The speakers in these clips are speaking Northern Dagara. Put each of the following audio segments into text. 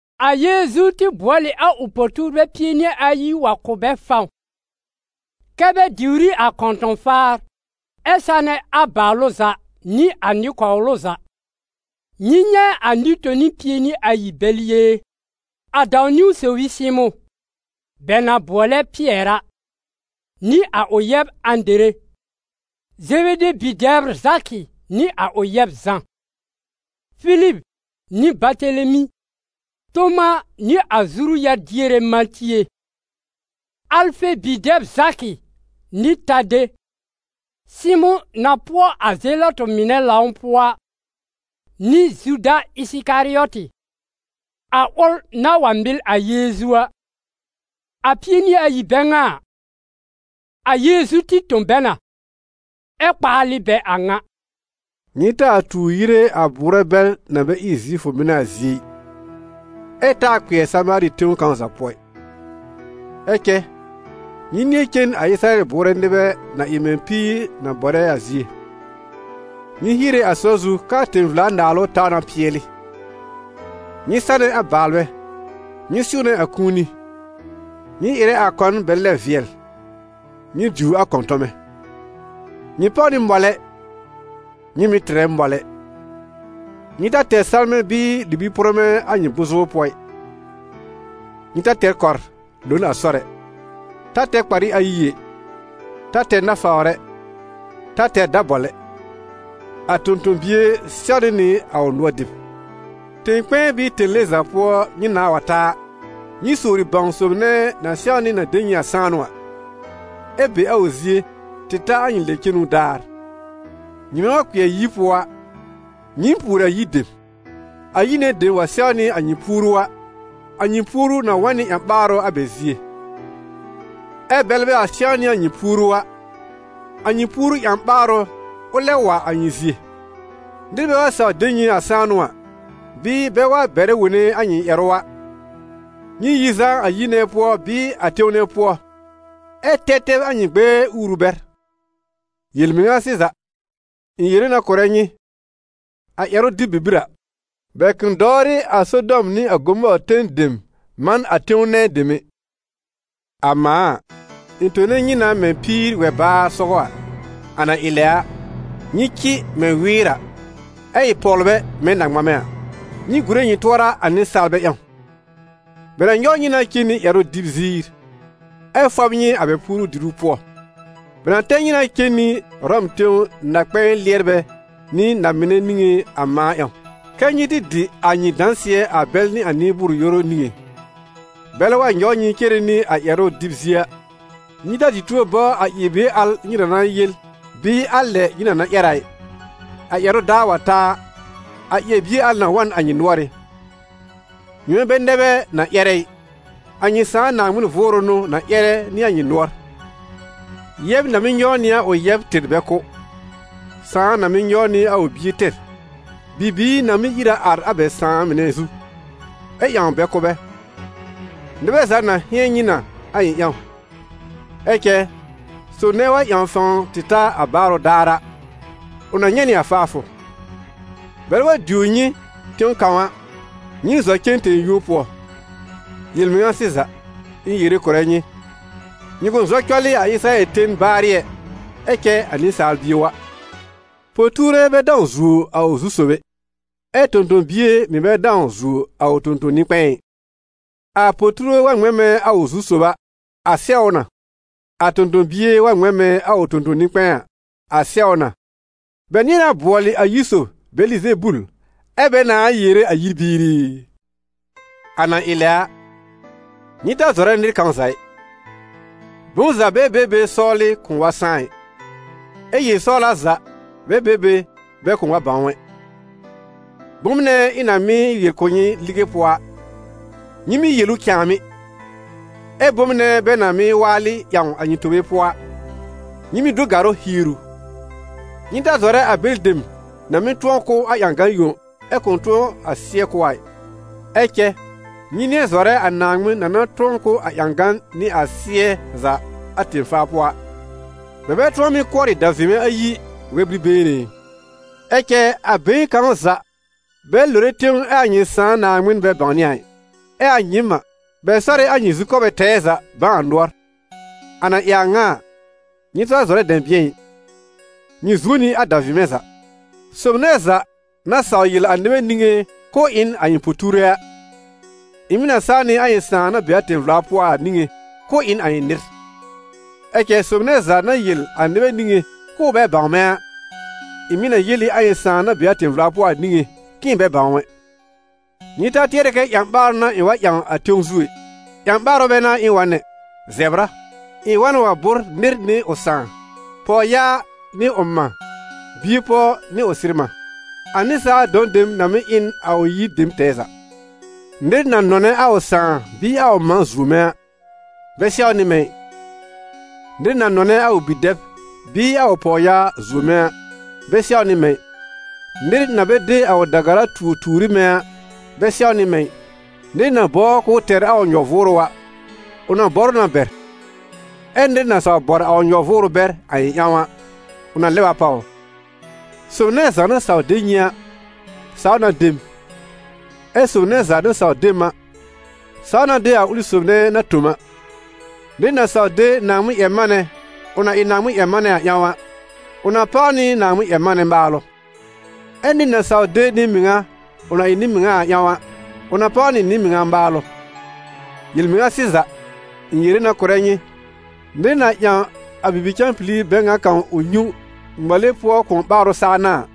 A Yeezu tɩ bʋɔl ɩ a ʋ po-tuurbɛ pie nɩ ayi wa kʋ̀ bɛ fãw, kɛ́ bɛ diwr ɩ a kɔ̃tɔ̃-faar ɛ sanɛ a baalʋ za nɩ a nɩ-kɔwlʋ za. Nyɩ nyɛ̃ a nɩ-toni pie nɩ ayi bɛl yée: a dãw-niwn sob ɩ Sɩmʋ̃, bɛ na bʋɔlɛ Pɩɛr a, nɩ a ʋ yɛb Ãdere, Zebede bi-dɛbr Zakɩ nɩ a ʋ yɛb Zã; Filib nɩ Batelemi, Toma nɩ a zuru-yar-diere Matie, Alfe bi-dɛb Zakɩ nɩ Tade; Sɩmʋ̃ na pʋɔ a Zelɔtɩ mɩnɛ lãw pʋɔ a, nɩ Zuda Ɩsɩkarɩɔtɩ, a ʋl na wa mɩl a Yeezu a. A pie nɩ ayi bɛ ŋa a, a Yeezu tɩ tõ bɛ na, ɛ kpaalɩ bɛ a ŋa: «Nyɩ taa tuur yire a bʋʋrɛ bɛl na bɛ ɩ Zifʋ mɩnɛ a zie ɩ, ɛ taa kpɩɛr Samaari tẽw kãw za pʋɔ ɩ. Ɛ cɛ nyɩ nɩ̃ɛ cen a Ɩsɩrayɛl bʋʋrɛ nɩbɛ na ɩ mɛ̃ píir na bɔr a zie. Nyɩ hiere a sɔr zu k'aa tẽ-vla-naalʋ taw na pɩɛlɩ. Nyɩ sanɛ a baalbɛ, nyɩ sɩ̃wnɛ a kũuni, nyɩ ɩrɛ a kɔn bɛ lɛb vɩɛl, nyɩ diwr a kɔ̃tɔmɛ. Nyɩ páw nɩ mɔlɛ, nyɩ mɩ̀ tɩrɛ mɔlɛ. Nyɩ ta tɛr salmɛ̃ bɩɩ libi-pʋrmɛ̃ a nyɩ bʋ̃-zʋbr pʋɔ ɩ. Nyɩ ta tɛr kɔr lo n a sɔr ɛ, ta tɛr kparɩ ayi ɛ, ta tɛr nafawr ɛ, ta tɛr dabɔl ɛ. A tõ-tõ-bie sɛwnɩ nɩ a ʋ nʋɔr dɩb. Tẽ-kpɛ̃ɛ bɩɩ tẽle za pʋɔ nyɩ nãá wa ta a, nyɩ sowri bãw a sob nɛ na sɛwnɩ na de nyɩ a sãanʋ a, ɛ be a ʋ zie tɩ ta a nyɩ lɛb-cenu daar. Nyɩmɛ wa kpɩɛr yir pʋɔ a, nyɩɩm pùori a yir dem. A yir nɛ dem wa sɛwnɩ a nyɩ puoru a, a nyɩ puoru na wa n nɩ ƴã-ɓaarʋ a bɛ zie, ɛ bɛlɛ bɛ wa sɛwnɩ a nyɩ puoru a, a nyɩ puoru ƴã-ɓaarʋ, ʋ lɛb wa a nyɩ zie. Nɩr bɛ wa saw de nyɩ a sãanʋ a, bɩɩ bɛ wa bɛrɛ wone a nyɩ ƴɛrʋ a, nyɩ yi zaa a yir nɛ pʋɔ bɩɩ a tẽw nɛ pʋɔ, ɛ tɛb tɛb a nyɩ gbɛɛ uuru bɛr. Yel-mɩŋa sɩza, ɩ̃ yere na kʋ̀rɛ nyɩ, a ƴɛrʋ-dɩb bibir a, bɛ kʋ̃ dɔwrɩ a Sodɔm nɩ a Gomɔɔr ten dem man a tẽw nɛ dem ɛ.» «A mãa a, ɩ̃ tone nyɩ na mɛ̃ píir wɛ-baar sɔgɔ a. A na ɩ lɛ a, nyɩ cɩ mɛ̃ wɩɩr a, ɛ ɩ pɔwlbɛ mɛ̃ na-ŋmamɛ a. Nyɩ gùre nyɩ tʋɔra a nɩsaalbɛ ƴãw: bɛ na nyɔw nyɩ na cen nɩ ƴɛrʋ-dɩb ziir, ɛ fɔb nyɩ a bɛ puoru-diru pʋɔ. Bɛ na tɛr nyɩ na cen nɩ Ʋrɔm tẽw na-kpɛ̃ɛ lɩɛrbɛ nɩ na-mɩnɛ niŋé a mãa ƴãw, kɛ́ nyɩ tɩ dɩ a nyɩ dãsɩɛ a bɛl nɩ a nɩ-bʋʋr-yoru niŋé. Bɛlɛ wa nyɔw nyɩ cere nɩ a ƴɛrʋ-dɩb-zie a, nyɩ ta dɩ tuo bɔbr a ƴɛr-bie al nyɩ na na yel bɩɩ a lɛ nyɩ na na ƴɛr a ɩ; a ƴɛrʋ daar wa ta a, a ƴɛr-bie al na wa n a nyɩ nʋɔrɩ́. Nyɩmɛ bɛ nɛ bɛ na ƴɛrɛ ɩ, a nyɩ Sãà Naaŋmɩn Vʋʋrʋ n'ʋ na ƴɛrɛ nɩ a nyɩ nʋɔr. Yɛb na mɩ́ nyɔw nɩ a ʋ yɛb tɩr bɛ kʋ́, sãà na mɩ́ nyɔw nɩ a ʋ bie tɩr, bibiir na mɩ́ ír a ar a bɛ sãà mɩnɛ zu, ɛ ƴãw bɛ kʋ́ bɛ. Nɩbɛ za na hɩ̃ɛn nyɩ na a ɩ̃ ƴãw. Ɛ cɛ sob nɛ wa ƴãw fãw tɩ ta a baarʋ daar a, ʋ na nyɛ̃ nɩ a faafʋ. Bɛlɛ wa diwr nyɩ tẽw kãw a, nyɩɩm zɔ cen tẽ-yũo pʋɔ; yel-mɩŋa sɩza, ɩ̃ yere kʋ̀rɛ nyɩ, nyɩ kʋ̃ zɔ cɔlɩ a Ɩsɩrayɛl ten baarɩ ɛ, ɛ cɛ a Nɩsaal Bie wa. Po-tuure bɛ dãw zuo a ʋ zu-sob ɛ, ɛ tõ-tõ-bie mɩ̀ bɛ dãw zuo a ʋ tõ-tõ-nɩ-kpɛ̃ɛ ɩ. A po-tuure wa ŋmɛ̃ mɛ̃ a ʋ zu-sob a, a sɛw ʋ na; a tõ-tõ-bie wa ŋmɛ̃ mɛ̃ a ʋ tõ-tõ-nɩ-kpɛ̃ɛ a, a sɛw ʋ na. Bɛ nɩ̃ɛ na bʋɔlɩ a yir sob Bɛlɩzebul, ɛ́ bɛ nãá yere a yir biir i!» «A na ɩ lɛ a, nyɩ ta zɔrɛ nɩr kãw za ɩ. Bom za bɛ be be sɔwlɩ kʋ̃ʋ wa sãá ɩ, ɛ yel-sɔwla za bɛ be be bɛ kʋ̃ʋ wa bãw ɛ. Bom nɛ ɩ̃ na mɩ́ yel kʋ̀ nyɩ lige pʋɔ a, nyɩ mɩ́ yel ʋ cãàmɩ́; ɛ bom nɛ bɛ na mɩ́ waalɩ ƴãw a nyɩ tobe pʋɔ a, nyɩ mɩ́ do gàrʋ́ hier ʋ. Nyɩ ta zɔrɛ a bɛlɩ dem na mɩ́ tʋ̃ɔ kʋ́ a ƴãgan yõ ɛ kʋ̃ tʋ̃ɔ a sɩ́ɛ kʋ́ a ɩ; ɛ cɛ nyɩ nɩ̃ɛ zɔrɛ a Naaŋmɩn na na tʋ̃ɔ kʋ́ a ƴãgan nɩ a sɩ́ɛ za a tẽ-faa pʋɔ a. Bɛ bɛ tʋ̃ɔ mɩ́ kʋɔrɩ davɩmɛ ayi wɛ-bir-been ɛ? Ɛ cɛ a been kãw za bɛ lore tẽw ɛ a nyɩ Sãà Naaŋmɩn bɛ bãwnɩ a ɩ. Ɛ a nyɩɩm a, bɛ sɔrɩ a nyɩ zukɔbɛ tɛɛ za bãw a nʋɔr. A na ɩ a ŋa a, nyɩ ta zɔrɛ dɛ̃bɩ̃ɛ ɩ, nyɩ zuo nɩ a davɩmɛ za.» «Sob nɛ za na saw yel a nɩbɛ niŋé k'ʋʋ ɩ n a ɩ̃ po-tuure a, ɩ̃ mɩ̀ na saw nɩ a ɩ̃ Sãà na be a tẽ-vla pʋɔ a niŋé k'ʋʋ ɩ n a ɩ̃ nɩr; ɛ cɛ sob nɛ za na yel a nɩbɛ niŋé k'ʋʋ bɛ bãw mɛ̃ a, ɩ̃ mɩ̀ na yel ɩ a ɩ̃ Sãà na be a tẽ-vla pʋɔ a niŋé k'ɩ̃ɩ bɛ bãw ʋ ɛ.» «Nyɩ ta tɩɛrɛ kɛ ƴã-ɓaarʋ n'a ɩ̃ wa ƴãw a tẽw zu ɛ: ƴã-ɓaarʋ bɛ n'a ɩ̃ wa n ɛ, zɛbr a. Ɩ̃ wa na wa bʋ́r nɩr nɩ ʋ sãà, pɔwyaa nɩ ʋ mã, bie-pɔw nɩ ʋ sɩr-mã. A nɩsaal dɔ̃ dem na mɩ́ ɩ n a ʋ yir dem tɛɛ za. Nɩr na nɔnɛ a ʋ sãà bɩɩ a ʋ mã zuo mɛ̃ a, bɛ sɛwnɩ mɛ̃ ɩ; nɩr na nɔnɛ a ʋ bi-dɛb bɩɩ a ʋ pɔwyaa zuo mɛ̃ a, bɛ sɛwnɩ mɛ̃ ɩ. Nɩr na bɛ de a ʋ da-gara tuo tuur ɩ mɛ̃ a, bɛ sɛwnɩ mɛ̃ ɩ. Nɩr na bɔbr k'ʋʋ tɛr a ʋ nyɔ-vʋʋrʋ a, ʋ na bɔr ʋ na bɛr; ɛ nɩr na saw bɔr a ʋ nyɔ-vʋʋrʋ bɛr a ɩ̃ ƴãw a, ʋ na lɛb a pàw ʋ.» «Sob nɛ za na saw de nyɩ a, saw na de m, ɛ sob nɛ za na saw de m a, saw na de a ʋlɩ sob nɛ na tõ m a. Nɩr na saw de Naaŋmɩn-ƴɛr-manɛ, ʋ na ɩ Naaŋmɩn-ƴɛr-manɛ a ƴãw a, ʋ na páw nɩ Naaŋmɩn-ƴɛr-manɛ maalʋ; ɛ nɩr na saw de nɩ-mɩŋa, ʋ na ɩ nɩ-mɩŋa a ƴãw a, ʋ na páw nɩ nɩ-mɩŋa maalʋ. Yel-mɩŋa sɩza, ɩ̃ yere na kʋ̀rɛ nyɩ, nɩr na ƴãw a bibi-cãpili bɛ ŋa kãw ʋ nyũ, ŋmale pʋɔ kʋ̃ɔ ɓaarʋ saa n'a a,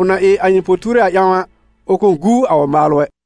ʋ na ɩ a ɩ̃ po-tuure a ƴãw a, ʋ kʋ̃ guu a ʋ maalʋ ɛ.»